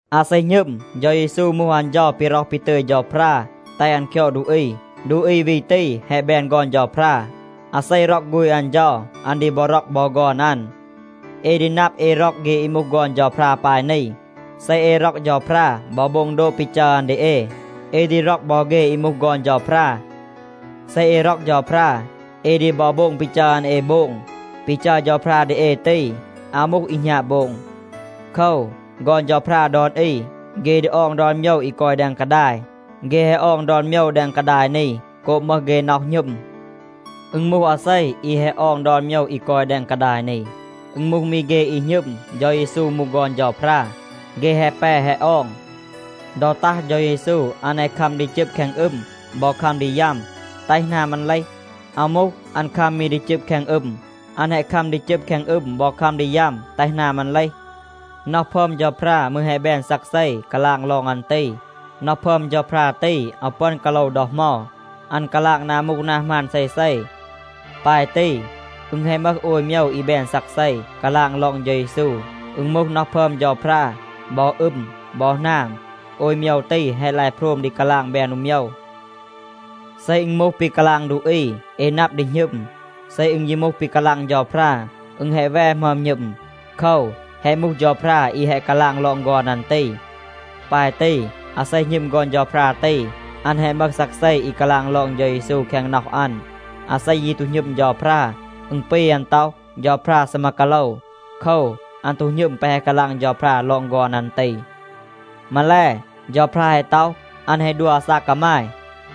อาเซ หณึม, เฌา เยซู มูห อัน เฌา ปี ร็อห ปี ตึย เฌาพรา แตห อัน คยอด ดูอี, ดูอี วี ตี แฮะ แบน ฆอน เฌาพรา. อาเซ ร็อก ฆูณ อัน เฌา, อัน ดี บอ ร็อก บอ ฆอน อัน. เอ ดี นับ เอ ร็อก เฆ อี มูห ฆอน เฌาพรา ปาย นี. เซ เอ ร็อก เฌาพรา บอ โบง โดบ ปี จัร อัน ดี เอ, เอ ดี ร็อก บอ เฆ อี มูห ฆอน เฌาพรา. เซ เอ ร็อก เฌาพรา, เอ ดี บอ โบง ปี จัร อัน เอ โบง. ปี จัร เฌาพรา ดี เอ ตี, อาว มูห อี หณาบ โบง. โคว, ฆอน เฌาพรา ดอน อี, เฆ ดี ออง ดอน โมยว อี กอย แดง กาดาย. เฆ แฮะ ออง ดอน โมยว แดง กาดาย นี โกบ มึห เฆ น็อห หณึม. อึณ มูห อาเซ อี แฮะ ออง ดอน โมยว อี กอย แดง กาดาย นี? อึณ มูห มี เฆ อี หณึม, เฌา เยซู มูห ฆอน เฌาพรา. เฆ แฮะ แป แฮะ ออง. ดอ ตัห เฌา เยซู อัน แฮะ คัม ดี จึบ แคง อึม บอ คัม ดี ยัม, แตห หนาม อัน เลห. อาว มูห, อัน คัม มี ดี จึบ แคง อึม. อัน แฮะ คัม ดี จึบ แคง อึม บอ คัม ดี ยัม แตห หนาม อัน เลห. น็อห พึอม เฌาพรา มืร แฮะ แบน ซักเซ, กาลาง ลอง อัน ตี. น็อห พึอม เฌาพรา ตี, อาว ปึอน กาโลว ดอ เหมา. อัน กาลาง นา มูห นา หมาน เซเซ. ปาย ตี, อึณ แฮะ มึห โอย โมยว อี แบน ซักเซ, กาลาง ลอง เฌา เยซู. อึณ มูห น็อห พึอม เฌาพรา, บอ อึม, บอ หนาม. โอย โมยว ตี, แฮะ ลาย โพรม ดี กาลาง แบน อู โมยว. เซ อึณ มูห ปี กาลาง ดูอี, เอ นับ ดี หณึม. เซ อึณ ยี มูห ปี กาลาง เฌาพรา, อึณ แฮะ แว หมึอม หณึม. โคว, แฮะ มูห เฌาพรา อี แฮะ กาลาง ลอง ฆอน อัน ตี. ปาย ตี, อาเซ หณึม ฆอน เฌาพรา ตี, อัน แฮะ มึห ซักเซ อี กาลาง ลอง เฌา เยซู แคง น็อห อัน. อาเซ ยี ตู หณึม เฌาพรา, อึณ ปี อัน ต็อห, เฌาพรา ซีมา กาโลว. โคว, อัน ตู หณึม แปะ แฮะ กาลาง เฌาพรา ลอง ฆอน อัน ตี. มาแล, เฌาพรา แฮะ ต็อห, อัน แฮะ ดัว อาซาก กามาย.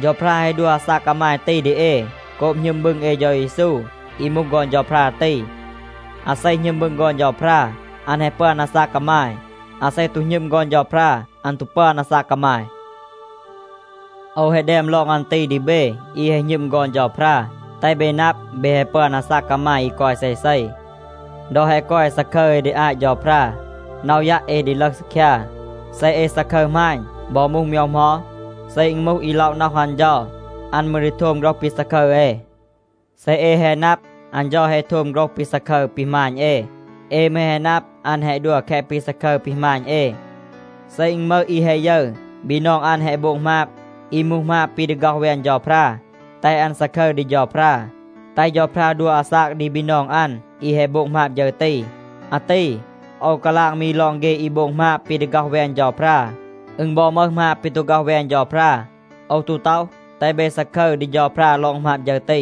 เฌาพรา แฮะ ดัว อาซาก กามาย ตี ดี เอ โกบ หณึม บึง เอ เฌา เยซู อี มูห ฆอน เฌาพรา ตี. อาเซ หณึม บึง ฆอน เฌาพรา, อัน แฮะ ปึอน อาซาก กามาย. อาเซ ตู หณึม ฆอน เฌาพรา, อัน ตู ปึอน อาซาก กามาย. โอว แฮะ แดม ลอง อัน ตี ดี เบ อี แฮะ หณึม ฆอน เฌาพรา, แตห เบ นับ, เบ แฮะ ปึอน อาซาก กามาย อี กอย เซเซ. ดอ แฮะ กอย ซาคึร เอ ดี อาต เฌาพรา, น็อห ยัะ เอ ดี ลึห ซีคยา. เซ เอ ซาคึร หมาณ บอ มูห โมยว เหมา, เซ อึณ มูห อี ล็อะ น็อห อัน เฌา, อัน มืร ดี โทม โฆรห ปี ซาคึร เอ. เซ เอ แฮะ นับ, อัน เฌา แฮะ โทม โฆรห ปี ซาคึร ปี หมาณ เอ, เอ มืร แฮะ นับ อัน แฮะ ดัว แคะ ปี ซาคึร ปี หมาณ เอ. เซ อึณ มึห อี แฮะ ยึร, บีนอง อัน แฮะ โบง หมาบ อี มูห หมาบ ปี ดี ฆ็อห แวน เฌาพรา, แตห อัน ซาคึร ดี เฌาพรา, แตห เฌาพรา ดัว อาซาก ดี บีนอง อัน อี แฮะ โบง หมาบ ฌึร ตี. อาตี โอว กาลาง มี ลอง เฆ อี โบง หมาบ ปี ดี ฆ็อห แวน เฌาพรา. อึณ บอ มึห หมาบ ปี ตู ฆ็อห แวน เฌาพรา. โอว ตู ต็อห, แตห เบ ซาคึร ดี เฌาพรา ลอง หมาบ ฌึร ตี.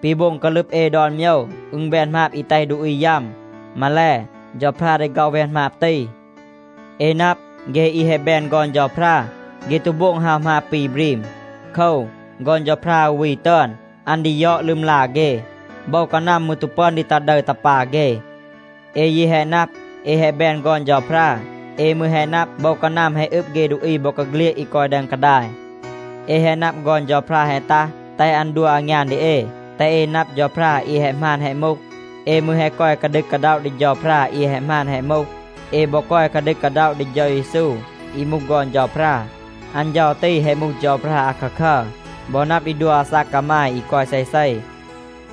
ปี โบง กาลึบ เอ ดอน โมยว, อึณ แบน หมาบ อี แตห ดูอี ยัม. มาแล, เฌาพรา ดี ฆ็อห แวน หมาบ ตี. เอ นับ, เฆ อี แฮะ แบน ฆอน เฌาพรา, เฆ ตู โบง ฮาว หมาบ ปี บรีม. โคว, ฆอน เฌาพรา อู วี ตึอน, อัน ดี ยอด ลึมลา เฆ. โบว กานัม มืร ตู ปึอน ดี ตา ดึร, ตา ปา เฆ. เอ ยี แฮะ นับ, เอ แฮะ แบน ฆอน เฌาพรา. เอ มืร แฮะ นับ, โบว กานัม แฮะ อึบ เฆ ดูอี บอกาเฆลียด อี กอย แดง กาดาย. เอ แฮะ นับ ฆอน เฌาพรา แฮะ ตัห, แตห อัน ดัว อางยาน ดี เอ, แตห เอ นับ เฌาพรา อี แฮะ หมาน แฮะ มูห. เอ มืร แฮะ กอย กาดึก กาด็อะ ดี เฌาพรา อี แฮะ หมาน แฮะ มูห. เอ บอ กอย กาดึก กาด็อะ ดี เฌา เยซู อี มูห ฆอน เฌาพรา. อัน เฌา ตี แฮะ มูห เฌาพรา อาคาคัร บอ นับ ดี ดัว อาซาก กามาย อี กอย เซเซ.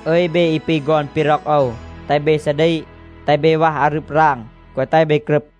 อึย เบ อี ปี ฆอน ปี ร็อก โอว, แตห เบ ซาดีก. แตห เบ วัห อารึบ ราง, แกวะ แตห เบ กรึบ.